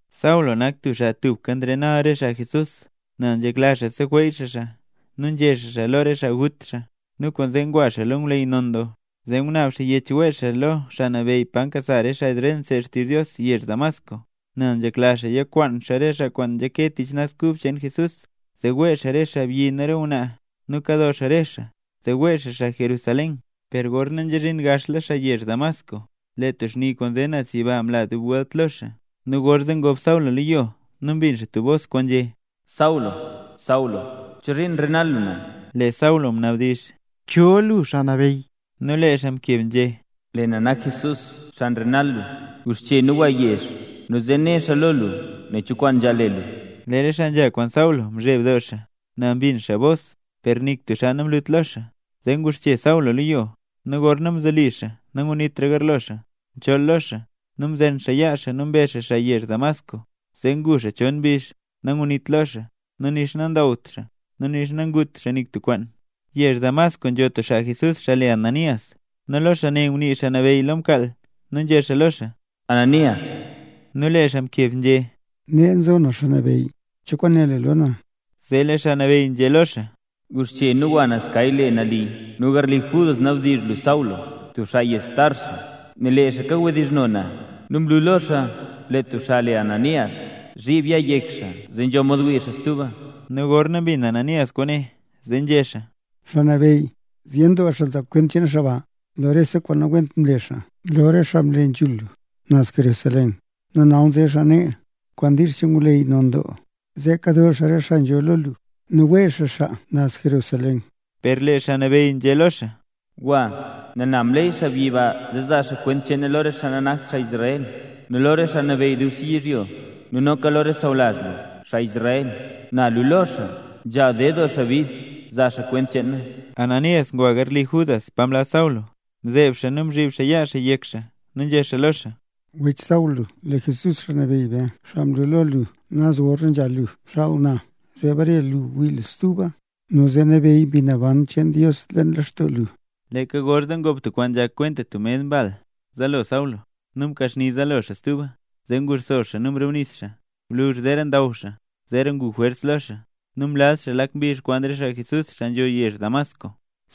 Saulo nak tub xaa tubka nrenal re xaa Jesús, nel nzhekla xaa seweey xaa xaa nu nzhe xaa xaa lo re xaa gut xaa. Nu kwaanzee ngwa xaa lo ngwleyy non doo, zee ngunaab xaa yech wee xaa lo xaa nabeyy pa nkasa re xaa Israel nseed xaa xtizh Dios yezh Damasco, nel nzhekla xaa yikwaan xaa re xaa kwaan nzhake tich Naz Kub cheen Jesús, zee wee xaa re xaabyi nu re ngwnaa, nu kado xaa re xaa, zee wee xaa xaa Jerusalén. Per gorna nzhazhin gaxla xaa yezh Damasco, lee tub xni kwaan nze naz yiba mla dub welt lo xaa. Nu gorzee ngob Saulo lo yo nu mbin xaa tub bos kwaan nzhé: —Saulo, Saulo, ¿chozhiin nrenal lu na? Lee Saulo mnabdizh: —¿Cho lu, Xaa Nabeyy? Nu lee xaa mkeb nzhé: —Lee na nak Jesús, xaa nrenal lu. Guxche nu gwa yezh nu zee né xaa lo lu nen cho kwaan nzhaal le lu. Lee re xaa nzha kwaan Saulo mzheb doo xaa; nel mbin xaa bos per nik tub xaa namlut lo xaa. Zee nguxche Saulo lo yo, nu gorna mzoli xaa nangnitra garlo xaa, mchool lo xaa. Nu mzen xaa yaa xaa nu mbe xaa xaa yezh Damasco. Zee ngu xaa chon mbizh nangnit lo xaa, nu nixa nandawt xaa, nu nixa nangut xaa nik tub kwaan. Yezh Damasco, nzho tub xaa Jesús, xaa le Ananías. Nu lo xaa ne ngunii Xaa Nabeyy lo mkaal, nu nzhé xaa lo xaa: —¡Ananías! Nu lee xaa mkeb nzhé: —Nee nzo na Xaa Nabeyy, ¿cho kwaan né lu lo na? Zee lee Xaa Nabeyy nzhé lo xaa: —Guxche nu gwa naz kay kwaan le Nali, nu garli Judas nabdizh lu Saulo, tub xaa yezh Tarso, nel lee xaa kawdizhno na. Nu mlu lo xaa lee tub xaabyi le Ananías, zhib yaa yek xaa, zee nzho mod wii xaa stuba. Nu gorna mbin Ananías kwaane, zee nzhé xaa: —Xaa Nabeyy, zyen doo xaa nzaa kwent cheen xaa ba nu rese kwaan nawent kwaan mle xaa lo re xaa mle nambey lu, naz Jerusalén. Nu nal nze xaa nee, kwaan diizh cheen ngwleyy non doo, zee kado xaa rese xaa nzholl lo lu nu wee xaa xaa naz Jerusalén. Per lee Xaa Nabeyy nzhé lo xaa: —Gwa, nel na mleey xaabyi ba zee zaa xaa kwent cheen na lo re xaa nanakt xaa Israel, nu lo re xaa nabeyy dubse yizhyo, nu noka lo re xaa sawlazh lu, xaa Israel. Na luu lo xaa nzhaal ded doo xaa bid zaa xaa kwent cheen na. Ananías ngwa garli Judas pa mlaz Saulo, mzeeb xaa nu mzhib xaa yaa xaa yek xaa, nu nzhé xaa lo xaa: —Wech Saulo, lee Jesús Xaa Nabeyy be, xaa mlu lo lu naz gorna nzha lu, mxaal na zee bare lu wii lu stuba nu zee nabeyy Mbi Naban cheen Dios lextoo lu. Leeka gorzee ngob tub kwaan nzhak kwenta tub med mbal zaalo Saulo nu mkaxni zaalo xaa stuba. Zee nguxso xaa zee mrubnis xaa. Gwluzh zeera ndaw xaa zeera ngu jwers lo xaa, nu mlaz xaa lak mbizh kwaan re xaa Jesús, xaa nzho yezh Damasco.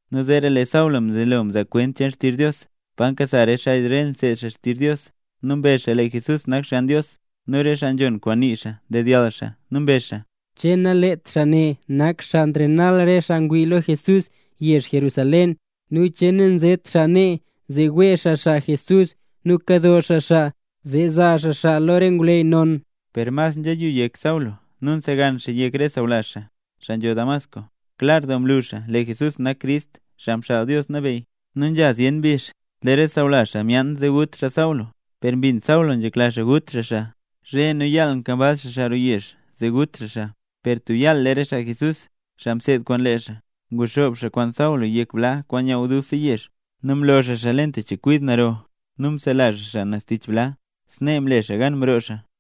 Nu zeera lee Saulo mzelo mzaa kwent xtizh Dios pa nkasa xaa Israel nseed xaa xtizh Dios, nu mbezh xaa lee Jesús nak Xgann Dios. Nu re xaa nzhon kwaan nii xaa ndedyall xaa, nu mbezh xaa: —¿Che nalet xaa ne, nak xaa nrenal re xaa ngwii lo Jesús yezh Jerusalén? ¿Nu che nanzet xaa nee, zee wee xaa xaa Jesús nu kado xaa xaa, zee zaa xaa xaa lo re ngwleyy non? Per mas nzhiyu yek Saulo nu nsegan xaa yek re sawlazh xaa, xaa nzho Damasco. Klar doo mlu xaa, lee Jesús nak Crist, Xaa Mxaal Dios Nabeyy. Nu nzha zyen mbizh, lee re sawlazh xaa myaan zee gut xaa Saulo, per mbin Saulo nzhekla xaa gut xaa xaa. Zhe nu yaal nkambaz xaa xaa roo yezh, zee gut xaa xaa. Per tub yaal lee re xaa Jesús, xaa mseed kwaan lee xaa, nguxoob xaa kwaan Saulo yek bla kwaan nyaaw dubse yezh, nu mlo xaa xaa leen tub chekwid naro, nu msela xaa xaa naz tich bla. Snee mle xaa gan mroo xaa.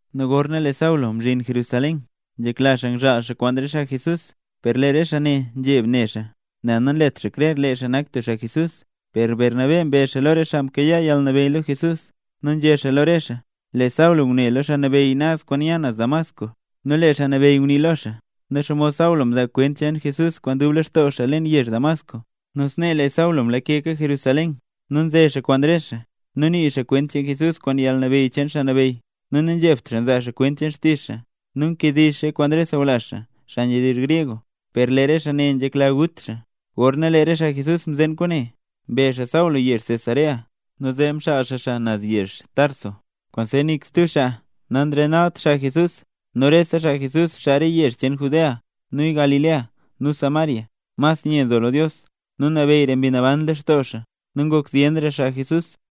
Nu gorna lee Saulo mzhin Jerusalén, nzhekla xaa ngzhaal xaa kwaan re xaa Jesús; per lee re xaa ne nzheb ne xaa, nel nanlet xaa krer lee xaa nak tub xaa Jesús. Per Bernabé mbe xaa lo re xaa mkayaa yalnabeyy lo Jesús, nu nzhé xaa lo re xaa lee Saulo ngune lo Xaa Nabeyy naz kwaan nya naz Damasco, nu lee Xaa Nabeyy ngunii lo xaa, nu xomod Saulo mzaa kwent cheen Jesús kwaan dub lextoo xaa leen yezh Damasco. Nu snee lee Saulo mlakeka Jerusalén nu nze xaa kwaan re xaa. Nii xaa kwent cheen Jesús kwaan yalnabeyy cheen Xaa Nabeyy, nu nanzhebt xaa nzaa xaa kwent xtizh xaa. Nu nkediizh xaa kwaan re xaa sawlazh, xaa nzhedizh gryeg; per lee re xaa ne nzhekla gut xaa. Gorna lee re xaa Jesús mzeen kwaane, mbe xaa Saulo yezh Cesarea, nu zee mxaal xaa xaa naz yezh Tarso. Kwaanzee nik stub xaa nanrenalt xaa Jesús. Nu rese xaa Jesús, xaa re yezh cheen Judea, nu Galilea nu Samaria mas nye nzo lo Dios, nu nabeyyra Mbi Naban lextoo xaa. Nu ngok zyenra xaa Jesús.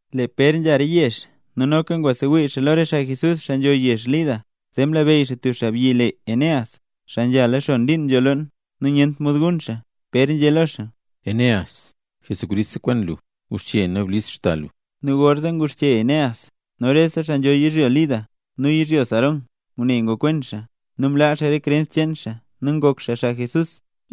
Lee Pér nzha re yezh nu noka ngwasewii xaa lo rese xaa Jesús, xaa nambey, xaa nzho yezh Lida. Zee mlabeyy xaa tub xaabyi le Eneas, xaa nzhala xon liin nzho loon, nu nyent mod gun xaa. Pér nzhé lo xaa: —Eneas, Jesucrist sekwen lu. Guxche nu blis xda lu. Nu gorzee nguxche Eneas. Nu rese xaa nzho yizhyo Lida nu yizhyo Sarón ngune ngokwen xaa, nu mlaa xaa re krens cheen xaa nu ngok xaa xaa Jesús.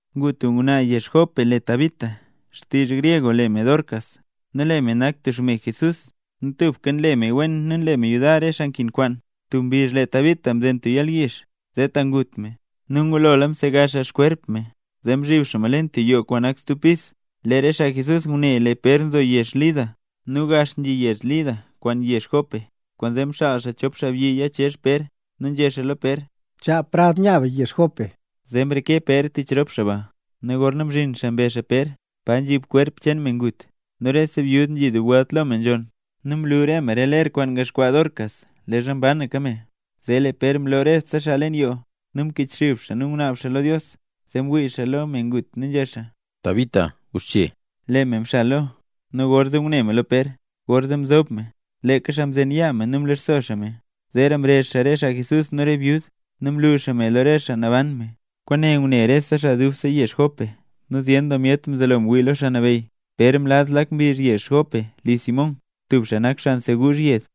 Ngu tub ngwnaa yezh Jope le Tabita, (xtizh gryeg le me Dorcas). Nu lee me nak tub xme Jesús, nu tubka nle me kwaan wen nu nle me yudar re xaa nkin kwaan. Tub mbizh zee, Tabita mzen tub yalyizh ta ngut me. Nu ngulola msegaz me kwerp cheen me, zee mzhib xaa me leen tub yoo kwaan nak stub pis. Lee re xaa Jesús ngune lee Pér nzo yezh Lida, nu gax nzhi yezh Lida kwaan yezh Jope, kwaanzee mxaal xaa chop xaabyi yichezh Pér, nu nzhé xaa lo Pér: —Chaa prad nya be yezh Jope. Zee mreke Pér tich rop xaa ba. Nu gorna mzhin xaa mbe xaa Pér pa nzhib kwerp cheen me ngut, nu rese byud nzhi dub welt lo me nzhonn, nu mlu me re ler kwaan ngaxkwaa Dorcas leezha mbanaka me. Zee lee Pér mloo rese xaa leen yoo, nu mkichxub xaa nu ngunaab xaa lo Dios, zee mwii xaa lo me ngut nu nzhé xaa: —Tabita. ¡Guxche! Lee me mxal zaalo, nu gorna ngune me lo Pér, gorzee mzob me. Lee xaa mzen yaa me nu mlisxo xaa me; zeera mrezh xaa re xaa Jesús nu re byud, re xaa nambey, nu mlu xaa me lo re xaa naban me. Kwaane ngune re xaa dubse yezh Jope nu zyen doo myet mzelo ngwii lo Xaa Nabeyy. Pér mlaz lak mbizh yezh Jope li Simón, tub xaa nak xaa nseguuzh yed.